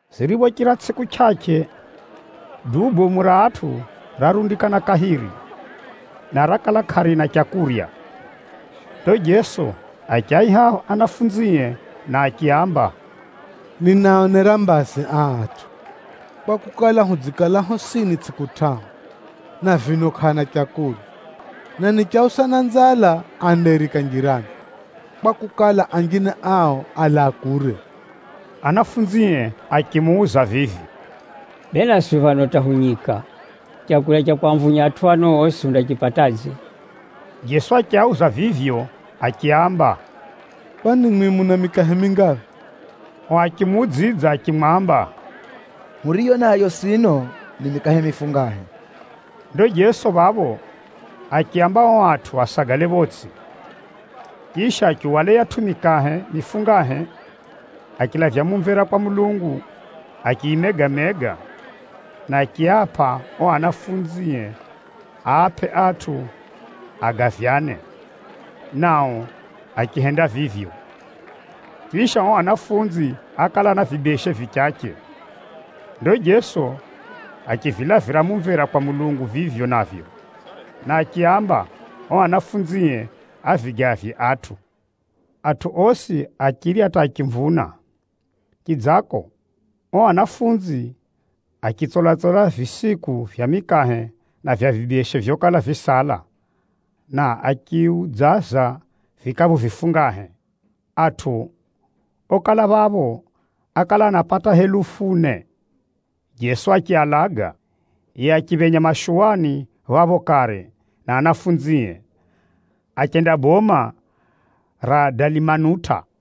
Ziriphochira tsʼiku chʼachʼe, duu bomu ra atʼu rarundikana kahiri, na rakala kʼarina leu. Ndo Jeso achiaiha anafunzie, na achiaamba, “Ninaaonera mbazi aa atʼu, kwakukala, hudzikala hosini tsʼiku tʼahu, na vino kʼaana leu. Na nichiausa na nzala, andairika njirani, kwakukala, anjine ao alaa kure.” Anafunzie achimuuza vivi, “Bee naswi phano hata hu nyika, leu ra kwamvunya atʼu ano osi hundaripatadze?” Jeso achiauza vivyo achiaamba, “Kwani mwimwi muna mikahe mingaphi?” Ao achimuudzidza achimwamba, “Huriyo nayo sino, ni mikahe mifungahe.” Ndo Jeso phapho achiaamba ao atʼu asagale photsʼi. Chisha, achihwala yiyatʼu mikahe mifungahe, achilavya mumvera kwa Mulungu, achiyimega-mega, na achiapʼa ao anafunzie aapʼe atʼu agavyane, nao achihenda vivyo. Chisha, ao anafunzi ákala ana vibeshe vichache. Ndo Jeso achivilavira mumvera kwa Mulungu vivyo navyo, na achiaamba ao anafunzie avigavye atʼu. Atʼu osi achirya hata achimvuna. Chidzako, ao anafunzi achitsola-tsola visiku vya mikahe na vya vibeshe vyokala visala, na achiudzaza vikaphu vifungahe. Atʼu okala phapho, ákala anapata helufu ne. Jeso achialaga, yiye achiphenya mashuwani phapho kare na anafunzie, achenda boma ra Dalimanuta.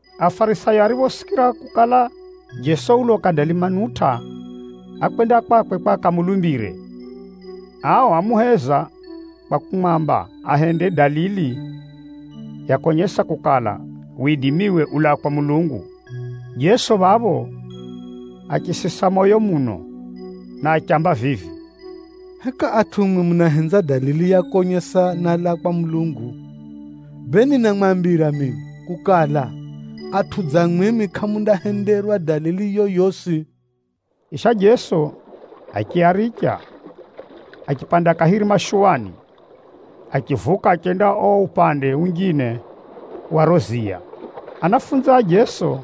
Afarisayo ariphosikira kukala, Jeso uloka Dalimanuta, ákwenda kwakwe kwa akamulumbire. Ao ámuheza kwa kumwamba ahende dalili ya konyesa kukala, widimiwe ulaa kwa Mulungu. Jeso phapho achisisa moyo muno, na achiamba vivi, “Heka atʼu mwimwi munahenza dalili ya konyesa, nálaa kwa Mulungu? Bee ninamwambira jeri mino kukala, atʼu dza mwimwi kʼamundahenderwa dalili yoyosi.” Chisha Jeso achiaricha, achipanda kahiri mashuwani, achivuka achenda uo upande unjine wa riro ziya. Anafunzi a Jeso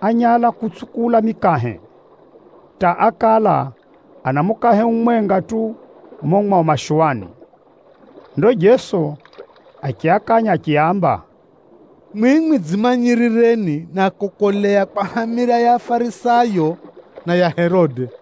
ányala kutsukula mikahe, hata ákala ana mukahe umwenga tu mumo mwao mashuwani. Ndo Jeso achiakanya achiaamba, “Mwimwi dzimanyirireni na kukolea kwa hamira ya Afarisayo, na ya Herode!”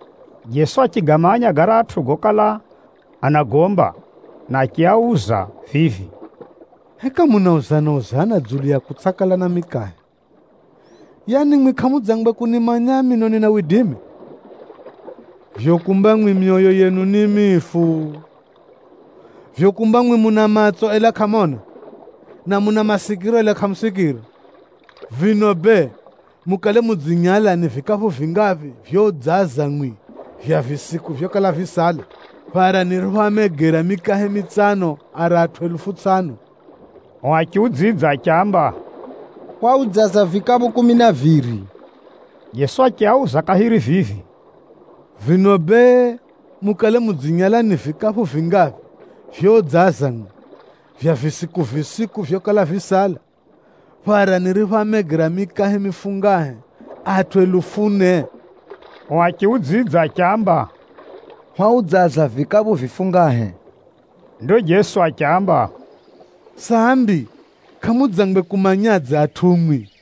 Jeso achigamanya garatʼu gokala anagomba, na achiauza vivi, “Heka munauzana-uzana dzulu ya kutsʼakala na mikahe? Yaani mwimwi kʼamudzangwe kunimanya mino nina widimi? Vivyo kumba mwimwi myoyo yenu ni mifu? Vivyo kumba mwimwi muna matso ela kʼamona, na muna masikiro ela kʼamusikira? Vino bee, mukale mudzinyala ni vikaphu vingaphi vyoudzaza mwimwi vya visiku vyokala visala, phara niriphoamegera mikahe mitsano ara atʼu helufu tsʼano?” Ao achiudzidza achiamba, “Hwaudzaza vikaphu kumi na viri.” Jeso achiauza kahiri vivi, “Vino bee, mukale mudzinyala ni vikaphu vingaphi vyoudzaza mwimwi, vya visiku-visiku vyokala visala, phara niriphoamegera mikahe mifungahe, atʼu helufu ne?” Ao achiudzidza achiamba, “Hwaudzaza vikaphu vifungahe.” Ndo Jeso achiaamba, “Sambi kʼamudzangwe kumanyadze atʼu mwimwi?”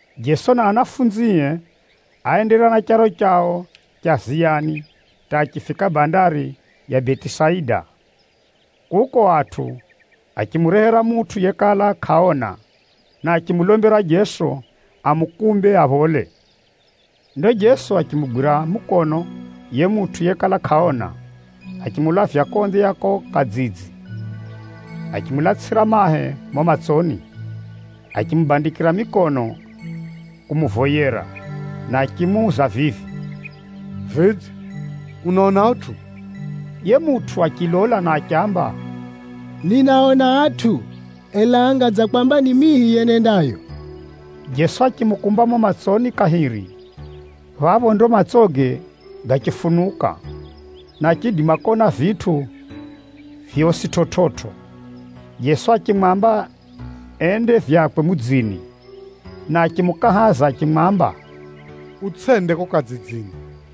Jeso na anafunzie áenderera na charo chao cha ziyani hata achifika bandari ya Betisaida. Kuko atʼu achimurehera mutʼu yekala kʼaona, na achimulombera Jeso amukumbe aphole. Ndo Jeso achimugwira mukono yiye mutʼu yekala kʼaona, achimulavya konze ya kuko kadzidzi. Achimulatsʼira mahe mumo matsoni, achimubandikira mikono kumuvoyera na achimuuza vivi, “Vidze, unaona utʼu?” Yiye mutʼu achilola na achiamba, “Ninaona atʼu, ela anga dza kwamba ni mihi yenendayo.” Jeso achimukumba mumo matsoni kahiri. Phapho ndo matsoge gachifunuka, na achiidima kona vitʼu vyosi chividzo. Jeso achimwamba ende vyakwe mudzini, na achimukahaza achimwamba, “Utsʼende kuko kadzidzini.”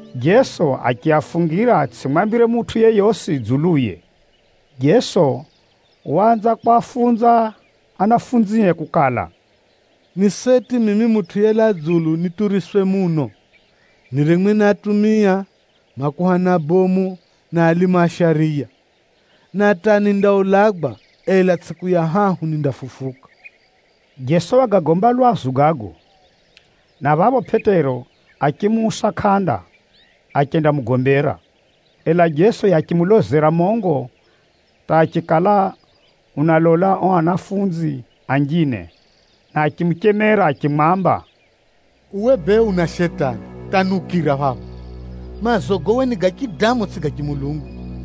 Jeso achiafungira atsʼimwambire mutʼu yeyosi dzuluye. Jeso waanza kwafunza anafunzie kukala, “Ni seti mimi Mutʼu yelaa dzulu nituriswe muno, niremwe ni atumia, makuhani abomu na alimu a shariya. Na hata nindaulagwa, ela tsʼiku ya hahu nindafufuka.” Jeso wagagomba lwazu gago, na phapho Pʼetero achimuusa kʼanda, achendamugombera. Ela Jeso yiye achimulozera mongo hata achikala unalola ao anafunzi anjine na achimuchemera Pʼetero achimwamba, “Uwe bee una Shetani hata niukira phapha! Maazogo uwe ni ga chidamu, tsʼigo ga chimulungu.”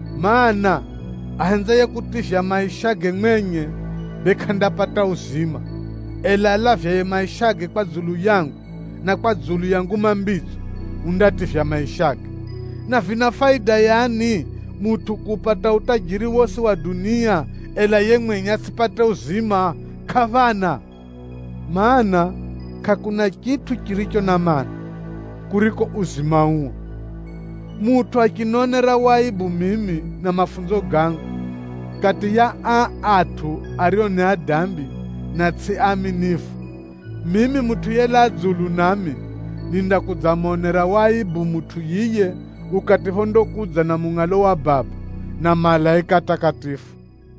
Maana, ahenzaye kutivya maishage mwenye, bee kʼandapata uzima uphya wa kare na kare, ela alavyaye maishage kwa dzulu yangu, na kwa dzulu ya Nguma Mbidzo, undativya maishage. Na vina faida yani, mutʼu kuupata utajiri wosi wa dunia, ela yiye mwenye atsʼipate uzima? Kʼaphana! Maana, kʼakuna chitʼu chiricho na maana, kuriko uzima uo. Mutʼu achinionera waibu mimi na mafunzo gangu, kati ya aa atʼu ario ni adambi na tsʼi aaminifu, mimi Mutʼu yelaa dzulu nami, nindakudzamonera waibu mutʼu yiye ukati phondakudza na mungʼalo wa Baba, na malaika atakatifu.”